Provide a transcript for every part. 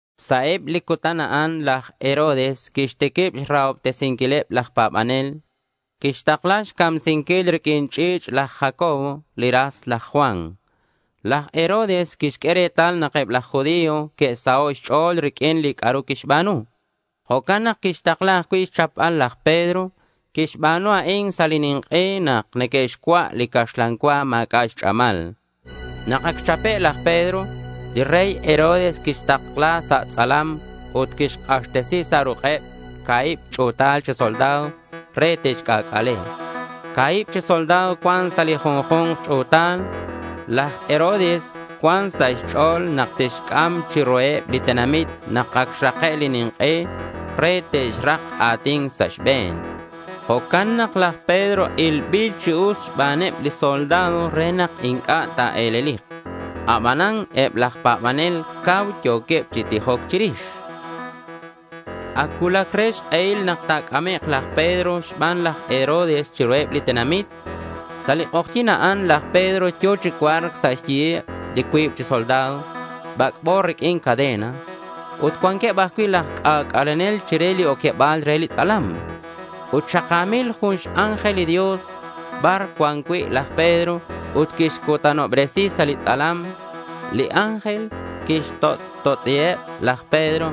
Sa' eb li cutan a'an laj Herodes quixtiquib xrahobtesinquileb laj pa̱banel. Quixtakla xcamsinquil riq'uin ch'i̱ch' laj Jacobo li ras laj Juan. Laj Herodes quixq'ue retal nak eb laj judío que'saho' xch'o̱l riq'uin li c'a'ru quixba̱nu. Jo'can nak quixtakla ajcui' xchapbal laj Pedro. Quixba̱nu a'in sa' li nink'e nak neque'xcua' li caxlan cua ma̱c'a' xch'amal. Nak ac xchape' laj Pedro, li rey Herodes quixtakla sa' tz'alam ut quixk'axtesi sa' ruk'eb ca̱hib ch'u̱tal chi soldado re te'xc'ac'ale. Ca̱hib chi soldado cuan sa' li junju̱nk ch'u̱tal. Laj Herodes cuan sa' xch'o̱l nak tixc'am chiruheb li tenamit nak ac xrake' li nink'e re te'xrak a̱tin sa' xbe̱n. Jo'can nak laj Pedro ilbil chi us xbaneb li soldado re nak inc'a' ta̱e̱lelik. Abanan eb laj pa̱banel cau yo̱queb chi tijoc chirix. Ac cuulac re xk'ehil nak ta̱c'amek' laj Pedro xban laj Herodes chiruheb li tenamit. Sa' li k'ojyi̱n a'an laj Pedro yo̱ chi cua̱rc sa' xyiheb li cuib chi soldado bac'bo riq'uin cadena. Ut cuanqueb ajcui' laj c'ac'alenel chire li oqueba̱l re li tz'alam. Ut xaka̱mil jun x-ángel li Dios bar cuan cui' laj Pedro ut quixcutanobresi sa' li tz'alam. Li ángel quixt'otz'otz'i laj Pedro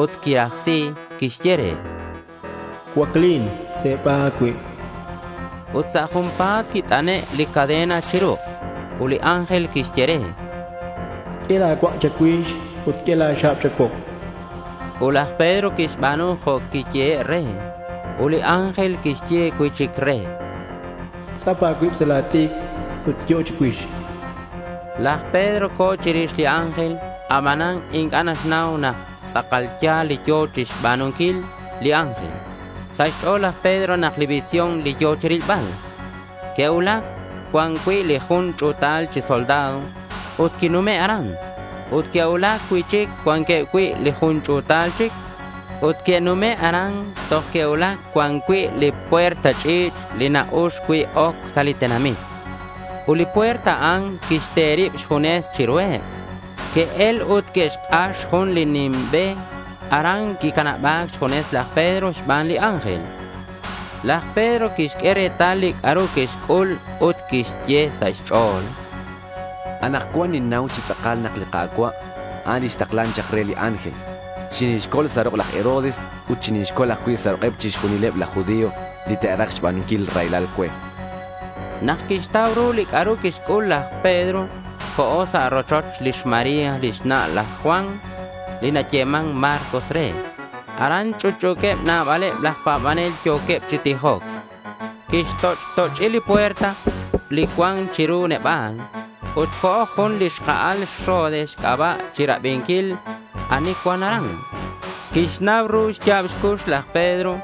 ut quirajsi. Quixye re: —Cuaclin. Se̱ba a̱cuib, chan. Ut sa' junpa̱t quit'ane' li cadena chi ruk'. Ut li ángel quixye re: —Q'ue la̱ cuak' cha̱cuix ut q'ue la̱ xa̱b cha̱cuok, chan re. Ut laj Pedro quixba̱nu jo' quiyehe' re. Ut li ángel quixye cui'chic re: —Tz'ap a̱cuib sa' la̱ t'icr ut yo'o chicuix, chan. Laj Pedro co̱ chirix li ángel. Abanan inc'a' naxnau nak tz'akal ya̱l li yo̱ chixba̱nunquil li ángel. Sa' xch'o̱l laj Pedro nak visión li yo̱ chirilbal. Que'cuulac cuan cui' li jun ch'u̱tal chi soldado ut que'nume' aran. Ut que'cuulac cui'chic cuanqueb cui' li jun ch'u̱tal chic. Ut que'nume' aran toj que'cuulac cuan cui' li puerta ch'i̱ch' li na-ux cui' oc sa' li tenamit. Ut li puerta a'an quixte rib xjunes chiruheb. Que'el ut que'xk'ax jun li nim be. Aran quicanaba̱c xjunes laj Pedro xban li ángel. Laj Pedro quixq'ue retal li c'a'ru quixc'ul ut quixye sa' xch'o̱l: —Anakcuan ninnau chi tz'akal nak li Ka̱cua', a'an li xtaklan chak re li ángel. Xinixcol sa' ruk' laj Herodes. Ut xinixcol ajcui' sa' ruk'eb chixjunileb laj judío li te'raj xba̱nunquil raylal cue, chan. Nak quixtau ru li c'a'ru quixc'ul, laj Pedro co̱ sa' rochoch lix María lix na' laj Juan li nayeman Marcos re. Aran ch'utch'u̱queb nabaleb laj pa̱banel yo̱queb chi tijoc. Quixt'och't'och'i li puerta li cuan chiru neba̱l. Ut co̱ jun li xka'al xRode xc'aba' chirabinquil ani cuan aran. Quixnau ru xya̱b xcux laj Pedro.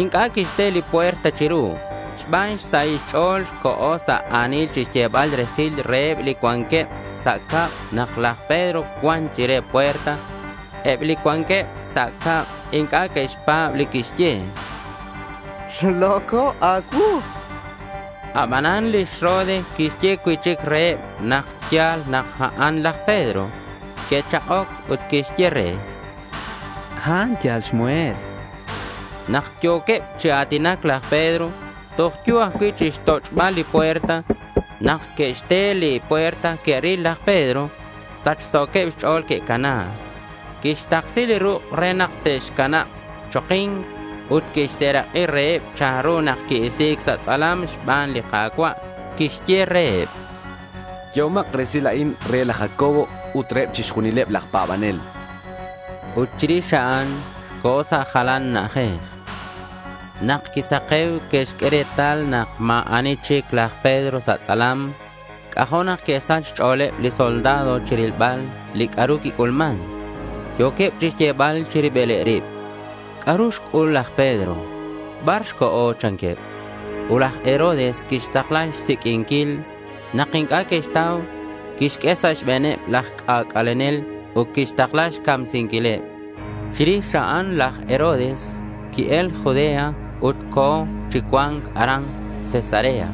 Inc'a' quixte li puerta chiru. Xban xsahil xch'o̱l, co̱ sa' a̱nil chixyebal resil reheb li cuanqueb sa' cab nak laj Pedro cuan chire puerta. Eb li cuanqueb sa' cab inc'a' que'xpa̱b li quixye. —Xlo̱co' a̱cuu, chanqueb re. Abanan lix Rode quixye cui'chic reheb nak ya̱l nak a'an laj Pedro. Que'chak'oc ut que'xye re: —A'an yal xmuhel, chanqueb re. Nak yo̱queb chi a̱tinac, laj Pedro toj yo̱ ajcui' chixtoch'bal li puerta. Nak que'xte li puerta que'ril laj Pedro. Sachso̱queb xch'o̱l que'cana. Quixtaksi li ruk' re nak te'xcanab choki̱nc, ut quixserak'i reheb chanru nak qui-isi̱c sa' tz'alam xban li Ka̱cua'. Quixye reheb: —Yehomak resil a'in re laj Jacobo ut reheb chixjunileb laj pa̱banel, chan. Ut chirix a'an co̱ sa' jalan na'ajej. Nak quisake̱u que'xq'ue retal nak ma̱ ani chic laj Pedro sa' tz'alam. C'ajo' nak que'sach xch'o̱leb li soldado chirilbal li c'a'ru quic'ulman. Yo̱queb chixyebal chi ribileb rib: —¿C'a'ru xc'ul laj Pedro? ¿Bar xco̱? chanqueb. Ut laj Herodes quixtakla xsiq'uinquil. Nak inc'a' que'xtau quixq'ue sa' xbe̱neb laj c'ac'alenel ut quixtakla xcamsinquileb. Chirix a'an laj Herodes qui-el Judea ut co̱ chi cua̱nc aran Cesarea.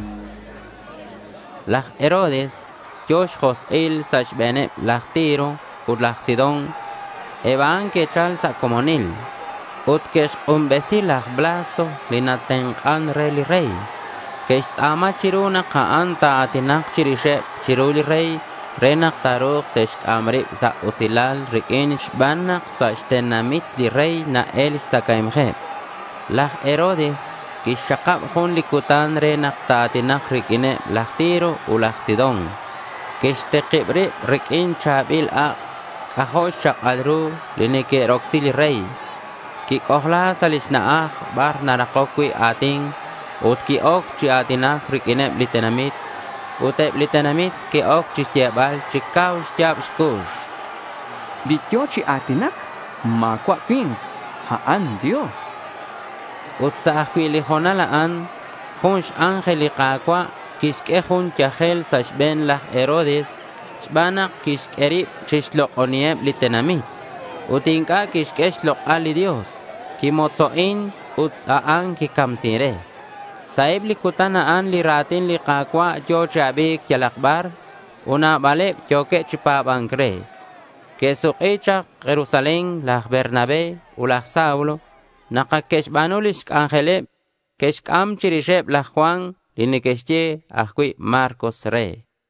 Laj Herodes yo̱ xjosk'il sa' xbe̱neb laj Tiro ut laj Sidón. Eb a'an que'chal sa' comonil. Ut que'xk'unbesi laj Blasto li natenk'an re li rey. Que'xtz'a̱ma chiru nak a'an ta̱a̱tinak chirixeb chiru li rey re nak ta̱ru̱k te'xc'am rib sa' usilal riq'uin xban nak sa' xtenamit li rey na-el xtzacae̱mkeb. Laj Herodes quixxakab jun li cutan re nak ta̱a̱tinak riq'uineb laj Tiro ut laj Sidón. Quixtikib rib riq'uin cha̱bil ak' c'ajo' xchak'al ru li neque'rocsi li rey. Quic'ojla sa' lix na'aj bar narakoc cui' a̱tin ut qui-oc chi a̱tinac riq'uineb li tenamit. Ut eb li tenamit que'oc chixyebal chi cau xya̱b xcux: —Li yo̱ chi a̱tinac ma̱cua' cui̱nk. A'an Dios, chanqueb. Ut sa' ajcui' li ho̱nal a'an, jun x-ángel li Ka̱cua' quixq'ue jun yajel sa' xbe̱n laj Herodes xban nak quixq'ue rib chixlok'oniheb li tenamit ut inc'a' quixq'ue xlok'al li Dios. Quimotzo'in ut a'an quicamsin re. Sa' eb li cutan a'an li ra̱tin li Ka̱cua' yo̱ chi abi̱c yalak bar. Ut nabaleb yo̱queb chi pa̱ba̱nc re. Que'suk'i chak Jerusalén laj Bernabé ut laj Saulo nak ac que'xba̱nu lix c'anjeleb. Que'xc'am chirixeb laj Juan, li neque'xye ajcui' Marcos re.